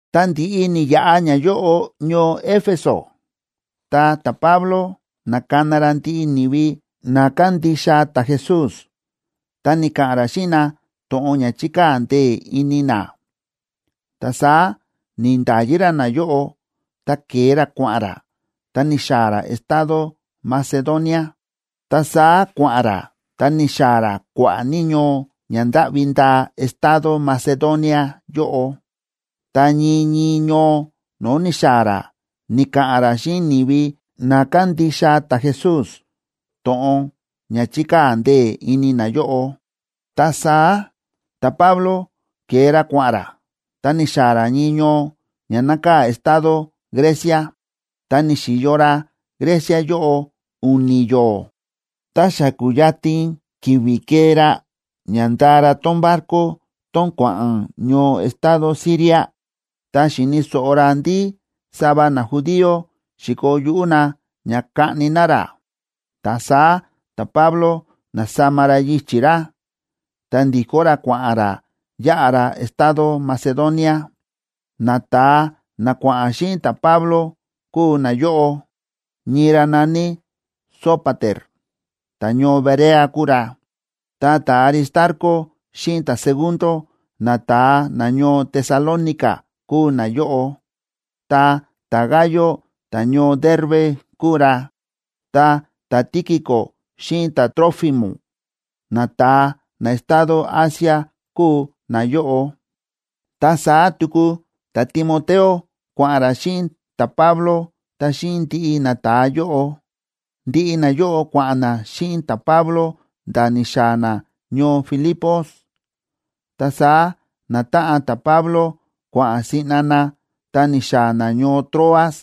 Ta ndi̱ꞌi ni̱yaꞌa ñayóꞌo ñoo Éfeso, ta ta̱Pablo na̱kana ra ndiꞌi ni̱vi na kándixa ta̱Jesús, ta ni̱ka̱ꞌa̱n ra xíꞌin na to̱ꞌon ña chi̱kaa̱ ndee̱ ini na. Ta saá ni̱nda̱yi ra nayóꞌo, ta ke̱e ra kua̱ꞌa̱n ra, ta ni̱xaa̱ ra estado Macedonia. Ta saá kua̱ꞌa̱n ra ta ni̱xaa̱ ra kua̱ꞌa̱ ní ñoo ña ndáꞌvi ndaa estado Macedonia yóꞌo, ta ñii ñii ñoo no̱o̱ ni̱xaa̱ ra ni̱ka̱ꞌa̱n ra xíꞌin ni̱vi na kándixa ta̱Jesús to̱ꞌon ña chi̱kaa̱ ndee̱ ini nayóꞌo. Ta saá ta̱Pablo ke̱e ra kua̱ꞌa̱n ra, ta ni̱xaa̱ ra ñii ñoo ña nákaa̱ estado Grecia. Ta ni̱xi̱yo ra Grecia yóꞌo u̱ni̱ yo̱o̱. Ta xa ku̱yatin ki̱vi̱ kee ra ña ndaa ra tón barco tón kua̱ꞌa̱n ñoo estado Siria, ta xi̱ni̱ so̱ꞌo ra ndí sava najudío xi̱koo yuꞌú na ña kaꞌni na ra. Ta saá ta̱Pablo na̱sama ra yichi̱ ra, ta ndi̱kó ra kua̱ꞌa̱n ra yáꞌa ra estado Macedonia. Nata̱a na kua̱ꞌa̱n xíꞌin ta̱Pablo kúu nayóꞌo: ñii ra na̱ní Sópater, ta̱ñoo Berea kúu ra, ta ta̱Aristarco xíꞌin ta̱Segundo, nata̱a nañoo Tesalónica kúu nayóꞌo; ta ta̱Gayo, ta̱ñoo Derbe kúu ra; ta ta̱Tíquico xíꞌin ta̱Trófimo, nata̱a na estado Asia kúu nayóꞌo, ta saá tuku ta̱Timoteo kua̱ꞌa̱n ra xíꞌin ta̱Pablo ta xíꞌin ndiꞌi nata̱a yóꞌo. Ndiꞌi nayóꞌo kua̱ꞌa̱n na xíꞌin ta̱Pablo nda̱ ni̱xaa̱ na ñoo Filipos. Ta saá natáꞌan ta̱Pablo kua̱ꞌa̱n siꞌna na ta ni̱xaa̱ na ñoo Troas,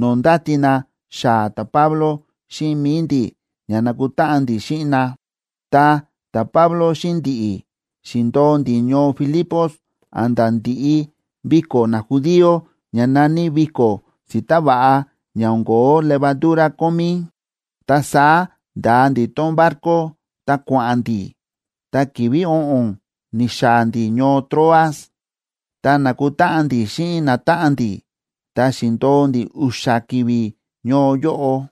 no̱o̱ ndáti na xaa̱ ta̱Pablo xíꞌin mi̱i ndi̱ ña nakutáꞌan ndi̱ xíꞌin na. Ta ta̱Pablo xíꞌin ndi̱ꞌi̱ xi̱ndo̱o ndi̱ ñoo Filipos a̱nda̱ ndi̱ꞌi viko̱ najudío ña na̱ní viko̱ si̱ta̱ váꞌa ña o̱n ko̱ó levadura kómí.a Ta saá nda̱a ndi̱ tón barco ta kua̱ꞌa̱n ndi̱ ta ki̱vi̱ o̱ꞌo̱n ni̱xaa̱ ndi̱ ñoo Troas, ta na̱kutáꞌan ndi̱ xíꞌin natáꞌan ndi̱, ta xi̱ndo̱o ndi̱ u̱xa̱ ki̱vi̱ ñoo yóꞌo.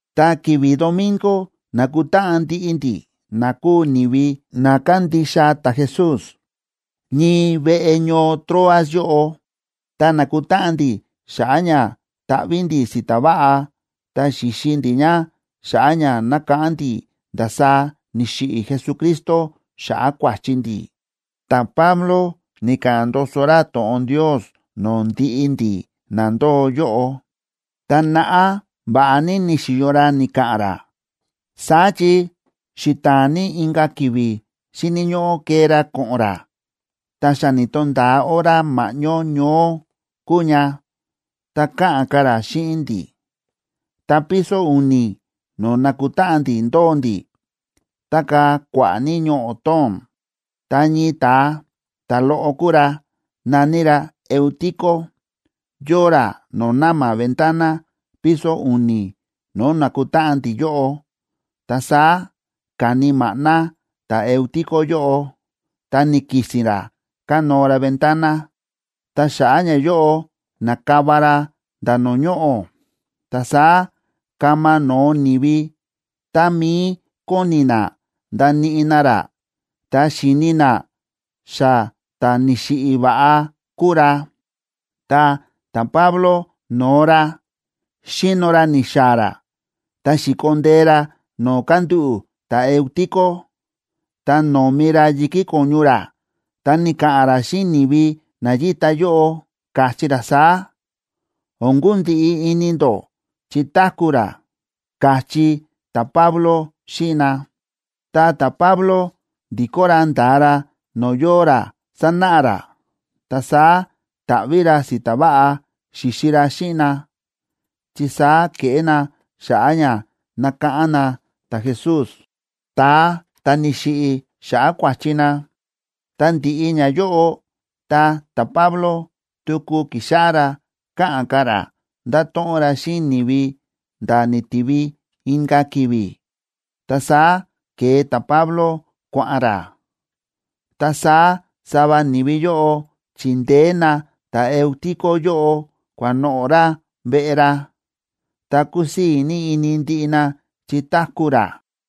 Ta ki̱vi̱ domingo na̱kutáꞌan ndiꞌi ndi̱, na kúu ni̱vi na kándixa ta̱Jesús, ñii veꞌe ñoo Troas yóꞌo. Ta na̱kutáꞌan ndi̱ xa̱ꞌa̱ ña taꞌví ndi̱ si̱ta̱ váꞌa ta xíxi ndi̱ ña xa̱ꞌa̱ ña nákáꞌán ndi̱ ndasaá ni̱xiꞌi̱ Jesucristo xa̱ꞌa̱ kua̱chi ndi̱. Ta̱Pablo ni̱ka̱ꞌa̱n ndoso ra to̱ꞌon Ndios no̱o̱ ndiꞌi ndi̱ na ndóo yóꞌo, ta naꞌá va̱ꞌa ní ni̱xi̱yo ra ni̱ka̱ꞌa̱n ra. Saá chi xita̱a̱n ní inka̱ ki̱vi̱ xíni̱ ñóꞌó kee ra ko̱ꞌo̱n ra. Ta xa ni̱to̱nda̱a hora ma̱ꞌñó ñoó kúu ña, ta káꞌa̱n ka̱ ra xíꞌin ndi̱. Ta piso u̱ni̱ no̱o̱ na̱kutáꞌan ndi̱ ndóo ndi̱ tákaa̱ kua̱ꞌa̱ ní ñoꞌo̱ tóo̱n. Ta ñii ta̱a, ta̱loꞌo kúu ra, na̱ní ra Eutico yóo ra no̱o̱ na̱ma̱ ventana piso u̱ni̱ no̱o̱ nákutáꞌan ndi̱ yóꞌo. Ta saá ka̱ni maꞌná ta̱Eutico yóꞌo, ta ni̱ki̱si̱n ra kánóo ra ventana, ta xa̱ꞌa̱ ñayóꞌo na̱kava ra nda̱ no̱o̱ ñoꞌo̱. Ta saá kama no̱o ni̱vi, tá mií kóni na ndaníꞌi na ra, ta xi̱ni na xa ta̱ni̱xiꞌi̱ va̱ꞌa kúu ra. Ta ta̱Pablo no̱o ra, xíno ra ni̱xaa̱ ra, ta xi̱ko ndee ra no̱o̱ kándúꞌu̱ ta̱Eutico, ta nómi ra yi̱kí ko̱ñu ra, ta ni̱ka̱ꞌa̱n ra xíꞌin ni̱vi na yíta yóꞌo, káchí ra saá: ―O̱n kundiꞌi ini ndó, chi táku̱ ra ―káchí ta̱Pablo xíꞌin na. Ta ta̱Pablo ndi̱kó ra nda̱a ra no̱o̱ yóo ra sánáꞌa ra. Ta saá ta̱ꞌví ra si̱ta̱ váꞌa xi̱xi ra xíꞌin na, chi saá kéꞌé na xa̱ꞌa̱ ña nákáꞌán na ta̱Jesús, ta̱a ta̱ ni̱xiꞌi̱ xa̱ꞌa̱ kua̱chi na. Ta ndi̱ꞌi ñayóꞌo, ta ta̱Pablo tuku ki̱xáꞌá ra káꞌa̱n ka̱ ra, nda̱to̱ꞌon ra xíꞌin ni̱vi nda̱ ni̱tivi inka̱ ki̱vi̱. Ta saá ke̱e ta̱Pablo kua̱ꞌa̱n ra. Ta saá sava ni̱vi yóꞌo chi̱ndeé na ta̱Eutico yóꞌo kua̱noꞌo̱ ra veꞌe ra, ta kúsii̱ ní ini ndiꞌi na chi táku̱ ra.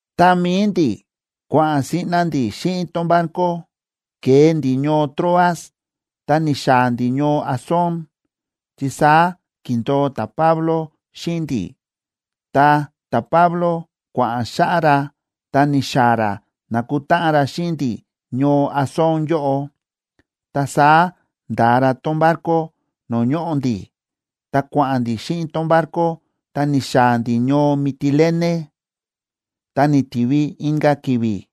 Ta mi̱i ndi̱, kua̱ꞌa̱n siꞌna ndi̱ xíꞌin tón barco, ke̱e ndi̱ ñoo Troas, ta ni̱xaa̱ ndi̱ ñoo Asón, chi saá ki̱ndo̱o ta̱Pablo xíꞌin ndi̱. Ta ta̱Pablo kua̱ꞌa̱n xáꞌá ra ta ni̱xaa̱ ra na̱kutáꞌan ra xíꞌin ndi̱ ñoo Asón yóꞌo. Ta saá nda̱a ra tón barco no̱o̱ ñóꞌo ndi̱, ta kua̱ꞌa̱n ndi̱ xíꞌin tón barco ta ni̱xaa̱ ndi̱ ñoo Mitilene. Ta ni̱tivi inka̱ ki̱vi̱,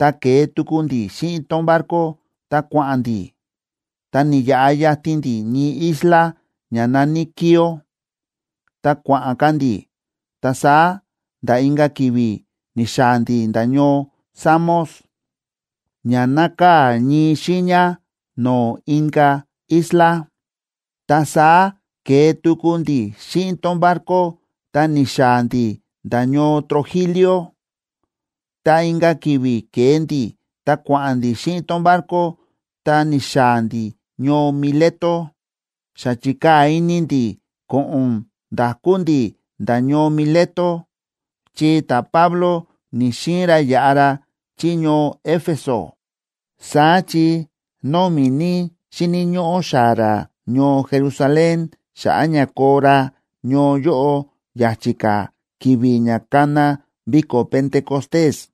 ta ke̱e tuku ndi̱ xíꞌin tón barco ta kua̱ꞌa̱n ndi̱, ta ni̱yaꞌa yatin ndi̱ ñii isla ña na̱ní Quío, ta kua̱ꞌa̱n ka̱ ndi̱, ta saá nda̱ inka̱ ki̱vi̱ ni̱xaa̱ ndi̱ nda̱ ñoo Samos, ña nákaa̱ ñii xiiña no̱o̱ inka̱ isla. Ta saá ke̱e tuku ndi̱ xíꞌin tón barco ta ni̱xaa̱ ndi̱ nda̱ ñoo Trogilio, ta inka̱ ki̱vi̱ ke̱e ndi̱ ta kua̱ꞌa̱n ndi̱ xíꞌin tón barco ta ni̱xaa̱ ndi̱ ñoo Mileto. Xa chi̱kaa̱ ini ndi̱ ko̱ꞌo̱n nda̱kú ndi̱ nda̱ ñoo Mileto, chi ta̱Pablo ni̱‑xiin ra yaꞌa ra chí ñoo Éfeso, saá chi nómi̱ ní xíni̱ ñóꞌó xaa̱ ra ñoo Jerusalén xa̱ꞌa̱ ña koo ra ñoo yóꞌo ya̱chi̱ ka̱ ki̱vi̱ ña kana viko̱ Pentecostés.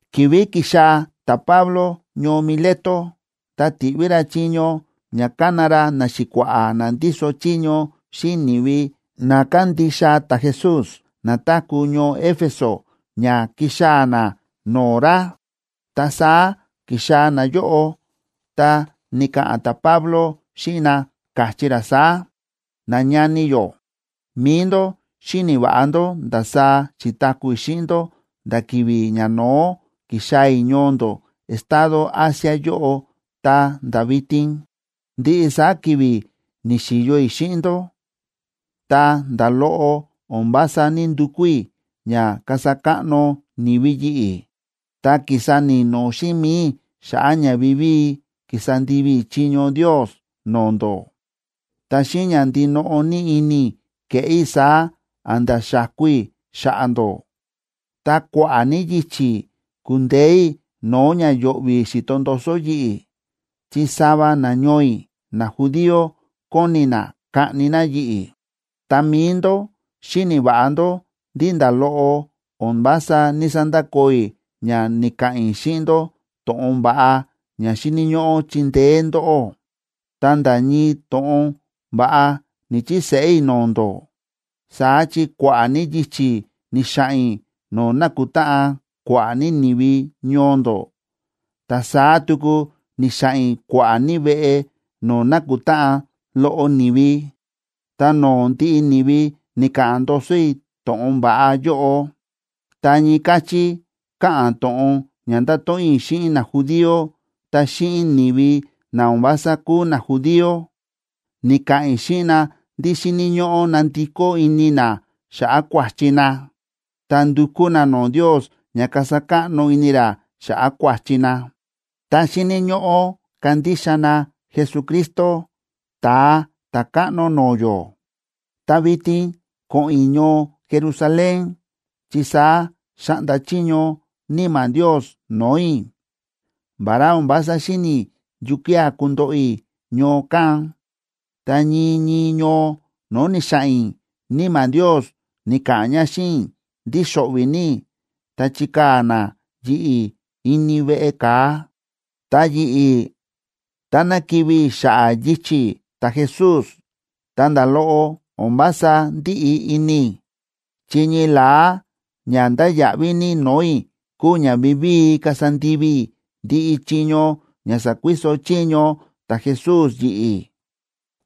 Ki̱vi̱ ki̱xaa̱ ta̱Pablo ñoo Mileto, ta ti̱ꞌví ra chiño ña ka̱na ra naxi̱kua̱ꞌa̱ na ndíso chiño xíꞌin ni̱vi na kándixa ta̱Jesús na táku̱ ñoo Éfeso ña kixaa̱ na no̱o̱ ra. Ta saá ki̱xaa̱ nayóꞌo, ta ni̱ka̱ꞌa̱n ta̱Pablo xíꞌin na, káchí ra saá: ―Nañani yó, mi̱i ndó xíni̱ va̱ꞌa ndó ndasaá xi̱taku̱ i̱ xíꞌin ndó nda̱ ki̱vi̱ ñano̱ó ki̱xaa̱ i̱ ñoo ndó estado Asia yóꞌo ta̱nda̱ vitin. Ndiꞌi saá ki̱vi̱ ni̱xi̱yo i̱ xíꞌin ndó, ta nda̱ loꞌo o̱n vása ní‑ndukú i̱ ña kasa káꞌno ni̱vi yi̱ꞌi̱, ta ki̱sa ni̱no̱ xíꞌin mi̱i i̱ xa̱ꞌa̱ ña vivíi ki̱sa ndivi i̱ chiño Ndios no̱o̱ ndó, ta xíꞌin ña ndinoꞌo ní ini i̱ ke̱ꞌé i̱ saá a̱nda̱ xa̱ku i̱ xa̱ꞌa̱ ndó. Ta kua̱ꞌa̱ ní yichi̱ ku̱ndeé i̱ no̱o̱ ña yo̱ꞌvi̱ xi̱to ndoso yi̱ꞌi̱, chi sava nañoo i̱ najudío kóni na kaꞌni na yi̱ꞌi̱. Ta mi̱i ndó xíni̱ va̱ꞌa ndó ndí nda̱ loꞌo o̱n vása ní‑sandakoo i̱ ña ni̱ka̱ꞌa̱n i̱ xíꞌin ndó to̱ꞌon va̱ꞌa ña xíni̱ ñóꞌó chindeé ndóꞌó, ta nda̱ ñii to̱ꞌon va̱ꞌa ni̱‑chiseꞌé i̱ no̱o̱ ndó. Saá chi kua̱ꞌa̱ ní yichi̱ ni̱xa̱ꞌa̱n i̱ no̱o̱ na̱kutáꞌan kua̱ꞌa̱ ní ni̱vi ñoo ndó, ta saá tuku ni̱xa̱ꞌa̱n i̱ kua̱ꞌa̱ ní veꞌe no̱o̱ na̱kutáꞌan loꞌo ni̱vi, ta no̱o̱ ndiꞌi ni̱vi ni̱ka̱ꞌa̱n ndoso i̱ to̱ꞌon va̱ꞌa yóꞌo. Ta ñii káchí káꞌa̱n to̱ꞌon ña ndáto̱ꞌon i̱ xíꞌin najudío ta xíꞌin ni̱vi na o̱n vása kúu najudío: ni̱ka̱ꞌa̱n i̱ xíꞌin na ndí xíni̱ ñóꞌó nandikó ini na xa̱ꞌa̱ kua̱chi na, ta ndukú na no̱o̱ Ndios ña kasa káꞌno ini ra xa̱ꞌa̱ kua̱chi na, ta xíni̱ ñóꞌó kandixa na Jesucristo, Ta̱a Ta̱káꞌno no̱o̱ yó. Ta vitin ko̱ꞌo̱n i̱ ñoo Jerusalén, chi saá xa̱ꞌnda chiño Níma̱ Ndios no̱o̱ i̱, vará o̱n vása xíni̱ i̱ yukía̱ kundoꞌo i̱ ñoo kán. Ta ñii ñii ñoo no̱o̱ ni̱xa̱ꞌa̱n i̱, Níma̱ Ndios ni̱ka̱ꞌa̱n ña xíꞌin i̱ ndí xo̱ꞌvi̱ ní i̱ ta chikaa̱ na yi̱ꞌi̱ ini veꞌe ka̱a. Ta yi̱ꞌi̱, táná kivi̱ i̱ xa̱ꞌa̱ yichi̱ ta̱Jesús, ta nda̱ loꞌo o̱n vása ndíꞌi ini i̱, chi ñii la̱á ña ndáya̱ꞌví ní no̱o̱ i̱ kúu ña vivíi kasa ndivi i̱ ndiꞌi chiño ña sa̱kuiso chiño ta̱Jesús yi̱ꞌi̱.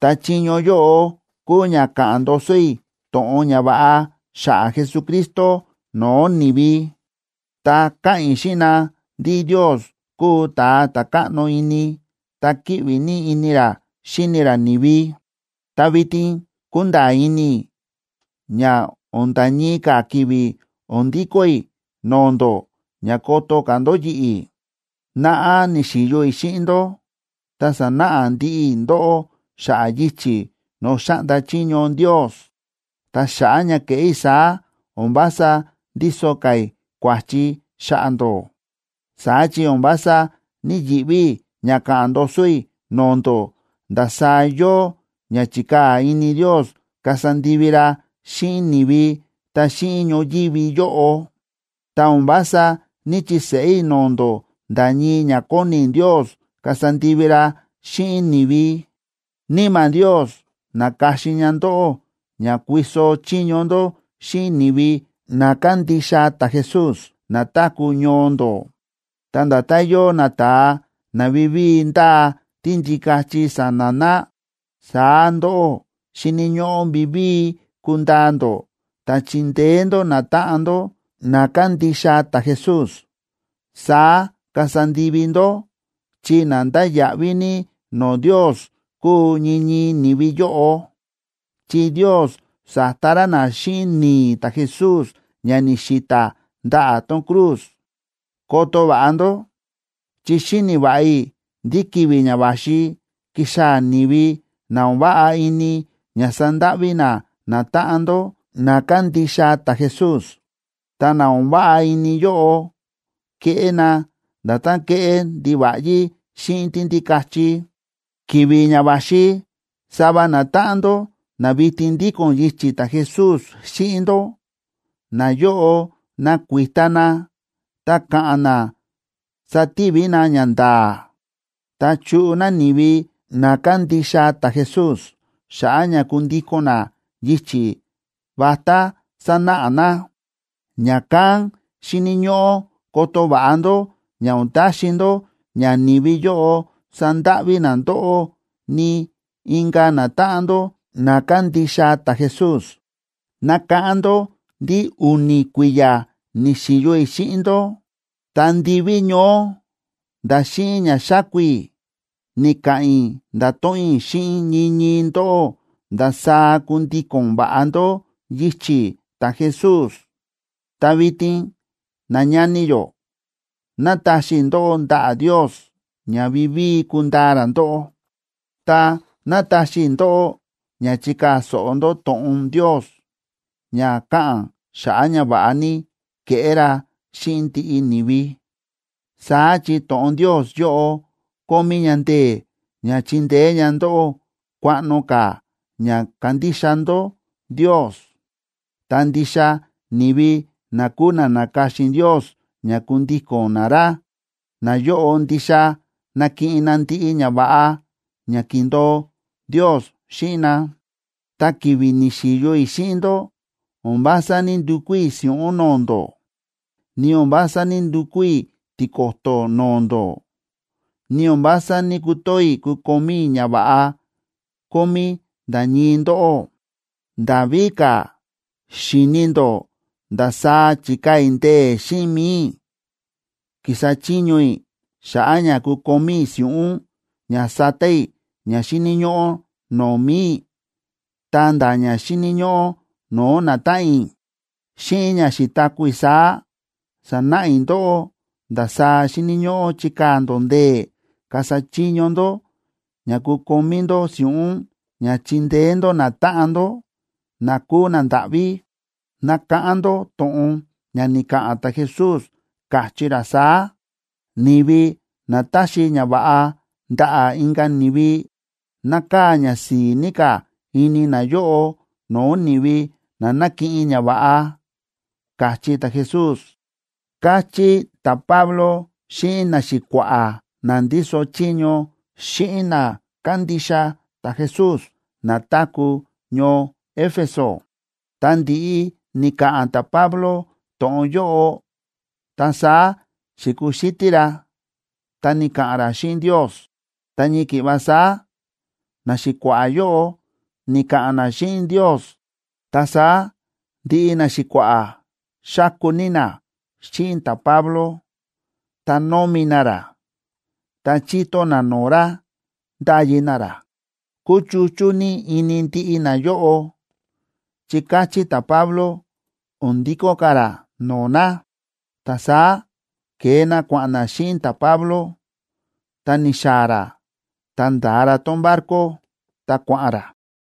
Ta chiño yóꞌo kúu ña káꞌa̱n ndoso i̱ to̱ꞌon ñava̱ꞌa xa̱ꞌa̱ Jesucristo no̱o̱ ni̱vi, ta káꞌa̱n i̱ xíꞌin na ndí Ndios kúu ta̱a ta̱ káꞌno ini, ta kíꞌvi ní ini ra xíni ra ni̱vi. ’Ta vitin kúnda̱a̱ ini i̱ ña o̱n nda̱ ñii ka̱ ki̱vi̱ o̱n ndikó i̱ no̱o̱ ndó ña koto ka̱ ndó yi̱ꞌi̱. Naꞌá ni̱xi̱yo i̱ xíꞌin ndó ta sa̱náꞌa ndiꞌi i̱ ndóꞌó xa̱ꞌa̱ yichi̱ no̱o̱ xáꞌnda chiño Ndios. Ta xa̱ꞌa̱ ña ke̱ꞌé i̱ saá, o̱n vása ndíso ka̱ i̱ kua̱chi xa̱ꞌa̱ ndó. Saá chi o̱n vása ní‑yiꞌví i̱ ña káꞌa̱n ndoso i̱ no̱o̱ ndó ndasaá yóo ña chi̱kaa̱ ini Ndios kasa ndivi ra xíꞌin ni̱vi ta xíꞌin ñoyívi yóꞌo, ta o̱n vása ní‑chiseꞌé i̱ no̱o̱ ndó nda̱ ñii ña kóni Ndios kasa ndivi ra xíꞌin ni̱vi. Níma̱ Ndios na̱ka̱xin ña ndóꞌó ña kuiso chiño ndó xíꞌin ni̱vi na kándixa ta̱Jesús na táku̱ ñoo ndó. Ta nda̱tán yóo nata̱a na vivíi ndáa tíndikachi sa̱na̱ na, saá ndóꞌó xíni̱ ñóꞌó vivíi kundaa ndó ta chindeé ndó natáꞌan ndó na kándixa ta̱Jesús. Saá kasa ndivi ndó chi na ndáya̱ꞌví ní no̱o̱ Ndios kúu ñii ñii ni̱vi yóꞌo, chi Ndios sa̱ta ra na xíꞌin ni̱i̱ ta̱Jesús ña ni̱xi̱ta̱ ndaꞌa̱ tón cruz. Koto va̱ꞌa ndó, chi xíni̱ va̱ꞌa i̱ ndí ki̱vi̱ ña va̱xi kixaa̱ ni̱vi na o̱n váꞌa ini ña sandáꞌví na natáꞌan ndó na kándixa ta̱Jesús. Ta na o̱n váꞌa ini yóꞌo keꞌé na nda̱tán kéꞌé ndiva̱ꞌyí xíꞌin tíndikachi. Ki̱vi̱ ña va̱xi sava natáꞌan ndó na vitin ndíko̱n yichi̱ ta̱Jesús xíꞌin ndó, nayóꞌo nakuita na ta ka̱ꞌa̱n na sativi na ñanda̱a̱, ta chuꞌu na ni̱vi na kándixa ta̱Jesús xa̱ꞌa̱ ña kundíko̱n na yichi̱ vatá sanáꞌa na. Ña̱kán xíni̱ ñóꞌó koto va̱ꞌa ndó ña o̱n taxi ndó ña ni̱vi yóꞌo sandáꞌví na ndóꞌó, ni inka̱ natáꞌan ndó na kándixa ta̱Jesús. Nakáꞌán ndó ndí u̱ni̱ kui̱ya̱ ni̱xi̱yo i̱ xíꞌin ndó, ta ndiví ñoó nda̱ xíꞌin ña xáku i̱, ni̱ka̱ꞌa̱n i̱ nda̱to̱ꞌon i̱ xíꞌin ñii ñii ndóꞌó ndasaá kundíko̱n va̱ꞌa ndó yichi̱ ta̱Jesús. ’Ta vitin, nañani yó, nátaxi i̱ ndóꞌó ndaꞌa̱ Ndios ña vivíi kundaa ra ndóꞌó. Ta nátaxi i̱ ndóꞌó ña chikaa̱ so̱ꞌo ndó to̱ꞌon Ndios ña káꞌa̱n xa̱ꞌa̱ ñava̱ꞌa ní kéꞌé ra xíꞌin ndiꞌi ni̱vi. Saá chi to̱ꞌon Ndios yóꞌo kómí ña ndee̱ ña chindeé ña ndóꞌó kuaꞌno ka̱ ña kándixa ndó Ndios. Ta ndixa ni̱vi na kúu na na̱ka̱xin Ndios ña kundíko̱n na ra, nayóꞌo ndixa nakiꞌin na ndiꞌi ñava̱ꞌa ña ki̱ndo̱o Ndios xíꞌin na. Ta ki̱vi̱ ni̱xi̱yo i̱ xíꞌin ndó o̱n vása ní‑ndukú i̱ si̱ꞌún no̱o̱ ndó, ni o̱n vása ní‑ndukú i̱ tiko̱to̱ no̱o̱ ndó, ni o̱n vása ní‑kutoo i̱ kukomí i̱ ñava̱ꞌa kómí nda̱ ñii ndóꞌó. Nda̱ víka̱, xíni̱ ndó ndasaá chi̱kaa̱ i̱ ndee̱ xíꞌin mi̱i i̱ ki̱sa chiño i̱ xa̱ꞌa̱ ña kukomí i̱ si̱ꞌún ña sata i̱ ña xíni̱ ñóꞌó no̱o̱ mi̱i i̱, ta̱nda̱ ña xíni̱ ñóꞌó no̱o̱ natáꞌan i̱. Xíꞌin ña xi̱taku̱ i̱ saá, sa̱náꞌa i̱ ndóꞌó ndasaá xíni̱ ñóꞌó chikaa̱ ndó ndee̱ kasa chiño ndó ña kukomí ndó si̱ꞌún ña chindeé ndó natáꞌan ndó, na kúu nandáꞌví. Nakáꞌán ndó to̱ꞌon ña ni̱ka̱ꞌa̱n ta̱Jesús, káchí ra saá: “Ni̱vi na táxi ñava̱ꞌa ndaꞌa̱ inka̱ ni̱vi, nákaa̱ ñasi̱i̱ ní ka̱ ini nayóꞌo no̱o̱ ni̱vi na na̱kiꞌin ñava̱ꞌa”, káchí ta̱Jesús ―káchí ta̱Pablo xíꞌin naxi̱kua̱ꞌa̱ na ndíso chiño xíꞌin na kándixa ta̱Jesús na táku̱ ñoo Éfeso. Ta ndi̱ꞌi ni̱ka̱ꞌa̱n ta̱Pablo to̱ꞌon yóꞌo, ta saá xi̱kuxítí ra, ta ni̱ka̱ꞌa̱n ra xíꞌin Ndios. Ta ñii ki̱ꞌva saá naxi̱kua̱ꞌa̱ yóꞌo ni̱ka̱ꞌa̱n na xíꞌin Ndios. Ta saá ndiꞌi naxi̱kua̱ꞌa̱ xáku ní na xíꞌin ta̱Pablo, ta nómi na ra, ta chíto na no̱o̱ ra ndáyi na ra. Kúchuchú ní ini ndiꞌi nayóꞌo chi káchí ta̱Pablo o̱n ndikó ka̱ ra no̱o̱ na. Ta saá ke̱e na kua̱ꞌa̱n na xíꞌin ta̱Pablo, ta ni̱xaa̱ ra ta nda̱a ra tón barco, ta kua̱ꞌa̱n ra.